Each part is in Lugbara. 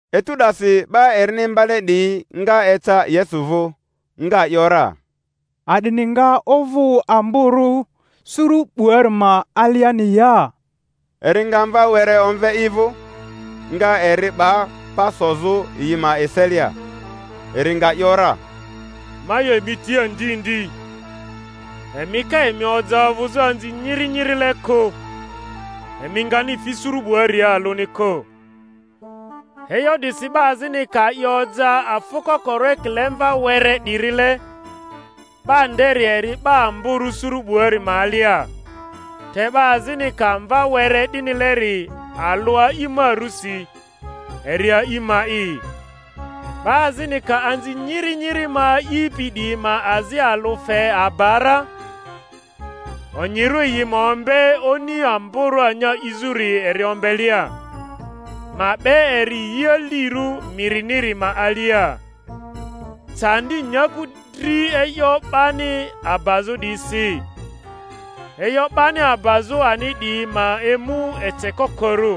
Etu 'dasi 'ba erini imbale 'diyi nga eca Yesu vᴜ, nga ‘yora, A'dini nga ovᴜ amborᴜ suru 'buarima aliani ya? Eri nga mva were omve i vᴜ, nga eri 'ba pa sozᴜ yi ma eselia, eri nga ‘yora, Ma 'yo emi tia ndi ndi, emi ka emi oja ovᴜzᴜ anzi nyiri nyirile kᴜ, emi ngani fi suru 'buaria alᴜni kᴜ. E'yo 'disi 'ba azini ka i oja afᴜ kokorᴜ ekile mva were 'dirile, 'ba nderi eri 'ba amborᴜ suru 'buari ma alia. Te 'ba azini ka mva were 'dinileri alᴜ a'i ma rusi, eri a'i ma'i; 'ba azini ka anzi nyiri nyiri ma a'ipi 'diyi ma azi alᴜ fe aba ra, onyirᴜ yi ma ombe oni amborᴜ anya 'izᴜri eri ombelea, ma 'be eri yi alirᴜ miriniri ma alia. Candi nyaku dri e'yo 'bani abazᴜ 'diyisi! E'yo 'bani abazᴜ ani 'diyi ma emu ecekokorᴜ,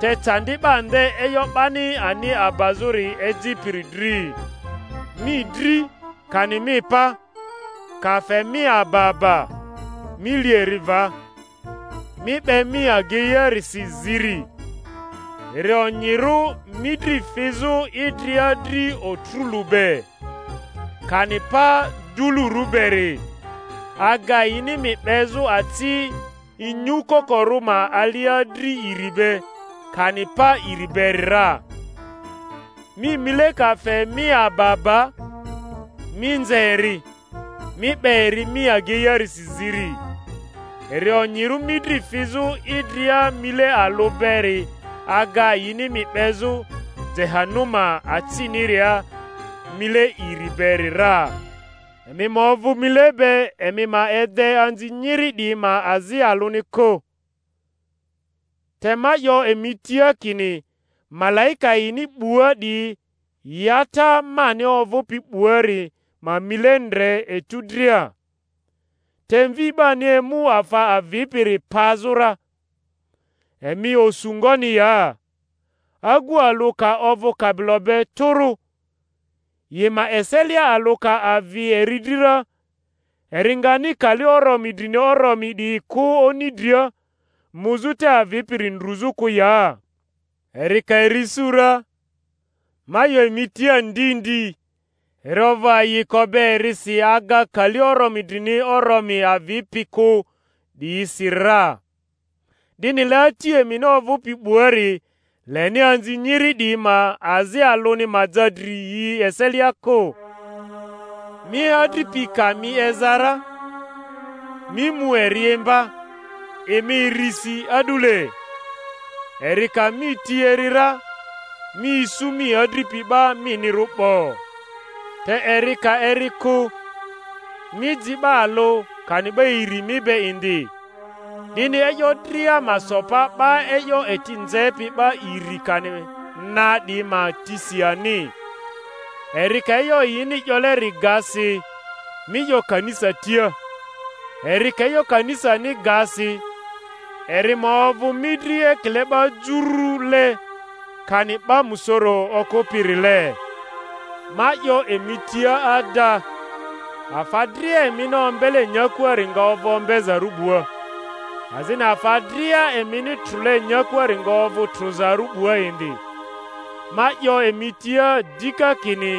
te candi 'ba nde e'yo 'bani ani abazᴜri ejipiri dri! Mi dri, kani mi pa, ka fe mi aba aba, mi li eri va, mi 'be mi ageiarisi ziri; eri onyirᴜ mi dri fizᴜ idria dri utrulu be, kani pa dulurᴜ beri, aga yini mi 'bezᴜ aci inyukokorᴜ ma alia dri iri be, kani pa iri beri ra. Mi mile ka fe mi aba aba, mi nze eri, mi 'be eri mi ageiarisi ziri; eri onyirᴜ mi dri fizᴜ idria mile alᴜ beri aga yini mi 'bezᴜ Jehanuma aciniria mile ir beri ra. Emi ma ovᴜ mile be emi ma ede anzi nyiri 'diyi ma azi alᴜni kᴜ; te ma 'yo emi tia kini malaika yini 'bua 'diyi yi Ata mani ovᴜpi 'buari ma mile ndre etu dria. Te Mvi 'bani emu afa avipiri pazᴜ ra. Emi osu ngoni ya? Agu alᴜ ka ovᴜ kabilo be tᴜrᴜ, yi ma eselia alᴜ ka avi eri dri ra, eri ngani kali oromi drini oromi 'diyi kᴜ oni dria, muzᴜ te avipiri ndruzᴜ kᴜ ya? Eri ka eri isu ra, ma 'yo emi tia ndi ndi, eri ovᴜ ayiko be erisi aga kali oromi drini oromi avipi kᴜ 'diyisiri ra. 'Dinile Ati emini ovᴜpi 'buari leni anzi nyiri 'diyi ma azi alᴜni ma ja dri yi eselia kᴜ. Mi adripi ka mi eza ra, mi mu eri imba, emi irisi a'dule. Eri ka mi ti eri ra, mi isu mi adripi 'ba minirᴜ 'bo. Te eri ka eri kᴜ, mi ji 'ba alᴜ, kani 'ba iri mi be indi, 'dini e'yo dria ma so pa 'ba e'yo eti nzepi 'ba iri kani na 'diyi ma tisi ani. Eri ka e'yo yini 'yoleri ga si, mi 'yo kanisa tia; eri ka e'yo kanisani ga si, eri ma ovᴜ mi dri ekile 'ba jurule, kani 'ba musoro okᴜpirile. Ma 'yo emi tia ada, afa dria emini ombele nyakuari nga ovᴜ ombezarᴜ 'bua, azini afa dria emini trᴜle nyakuari nga ovᴜ trᴜzarᴜ 'bua indi. Ma 'yo emi tia dika kini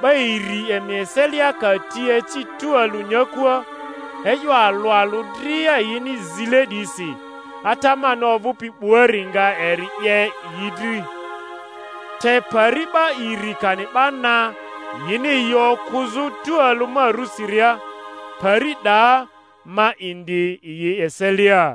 'ba iri emi eselia ka ti eci tualᴜ nyakua e'yo alᴜ alᴜ dria yini zile 'diyisi, Ata mani ovᴜpi 'buari nga eri 'ye yi dri. Te pari 'ba iri kani 'ba na yini yi okᴜzᴜ tualᴜ ma rusiria, pari 'daa ma indi yi eselia.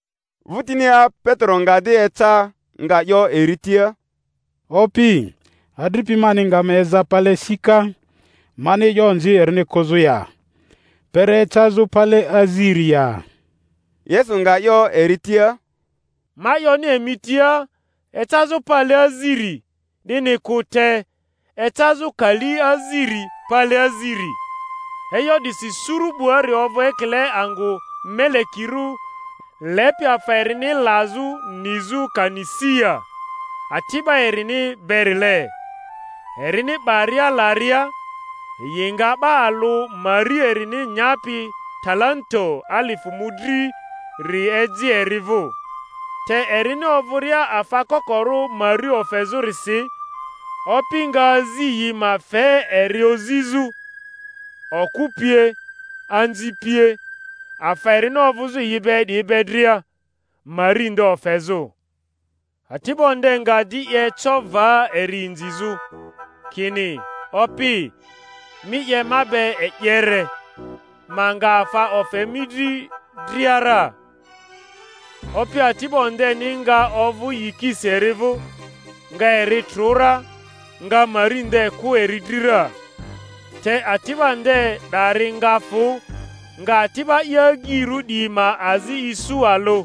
Vᴜtinia Petero nga di eca, nga 'yo eri tia, Opi, adripi mani nga ma eza pale si ka, mani e'yo onzi erini kᴜzᴜ ya? Kpere ecazᴜ pale aziri ya? Yesu nga 'yo eri tia, Ma 'yoni emi tia, Ecazᴜ pale aziri, 'dini kᴜ; te, Ecazᴜ kali aziri pale aziri. E'yo 'disi suru 'buari ovᴜ ekile agu melekirᴜ lepi afa erini lazᴜ nizᴜ kani si ya, ati'ba erini berile. Erini 'baria laria, yi nga 'ba alᴜ mari erini nyapi talanto alifᴜ mᴜdriri eji eri vᴜ; te erini ovᴜria afa kokorᴜ mari ofezᴜrisi, opi nga azi yi ma fe eri ozizᴜ, okᴜ pie, anzi pie, afa erini ovᴜzᴜ yi be 'diyi be dria, mari nde ofezᴜ. Ati'bo nde nga di i eco va eri inzizᴜ, kini, Opi, mi 'ye ma be e'yere, ma nga afa ofe mi dri dria ra. Opi ati'bo ndeni nga ovᴜ yikisi eri vᴜ, nga eri trᴜ ra, nga mari nde kᴜ eri dri ra. Te ati'bo nde 'dari nga fᴜ, nga ati'ba i agyirᴜ 'diyi ma azi isu alᴜ,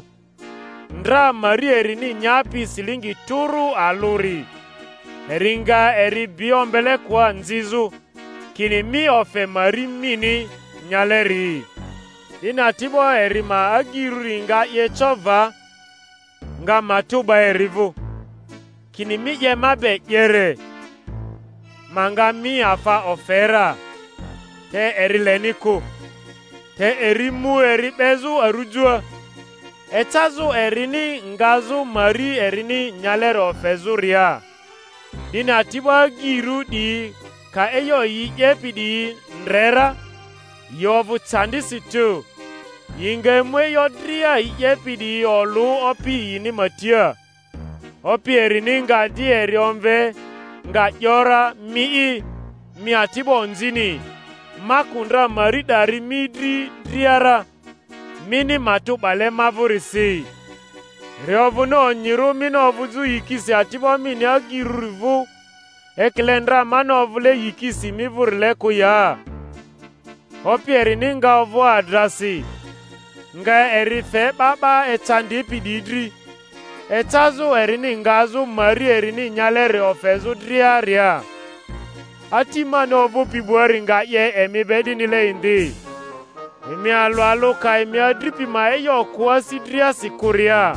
ndra mari erini nyapi silingi tᴜrᴜ alᴜri; eri nga eri bi ombelekoa nzizᴜ, kini, Mi ofe mari mini nyaleri. 'Dini ati'bo eri ma agyirᴜ nga i eco va, nga matᴜ 'ba eri vᴜ, kini, Mi 'ye ma be e'yere, ma nga mi afa ofe ra. Te eri leni kᴜ, te eri mu eri 'bezᴜ arujoa, ecazᴜ erini ngazᴜ mari erini nyaleri ofezᴜria. 'Dini ati'ba agyirᴜ 'diyi ka e'yo yi 'yepi 'diyi ndre ra, yi ovᴜ candisi tᴜ, yi nga emu e'yo dria yi 'yepi 'diyi olᴜ opi yini ma tia. Opi erini nga di eri omve, nga ‘yora, Mi'i, mi ati'bo onzini, ma kᴜ ndra mari 'dari mi dri dria ra, mini matᴜ 'bale ma vᴜrisi; eri ovᴜni onyirᴜ mini ovᴜzᴜ yikisi ati'bo mi agyirᴜri vᴜ, ekile ndra mani ovᴜle yikisi mi vᴜrile kᴜ ya? Opi erini nga ovᴜ adrasi, nga eri fe 'ba 'ba ecandipi 'diyi dri, ecazᴜ erini ngazᴜ mari erini nyaleri ofezᴜ driaria. Ati mani ovᴜpi 'buari nga 'ye emi be 'dinile indi, emi alᴜ alᴜ ka emi adripi ma e'yo kᴜ asi driasi kᴜria.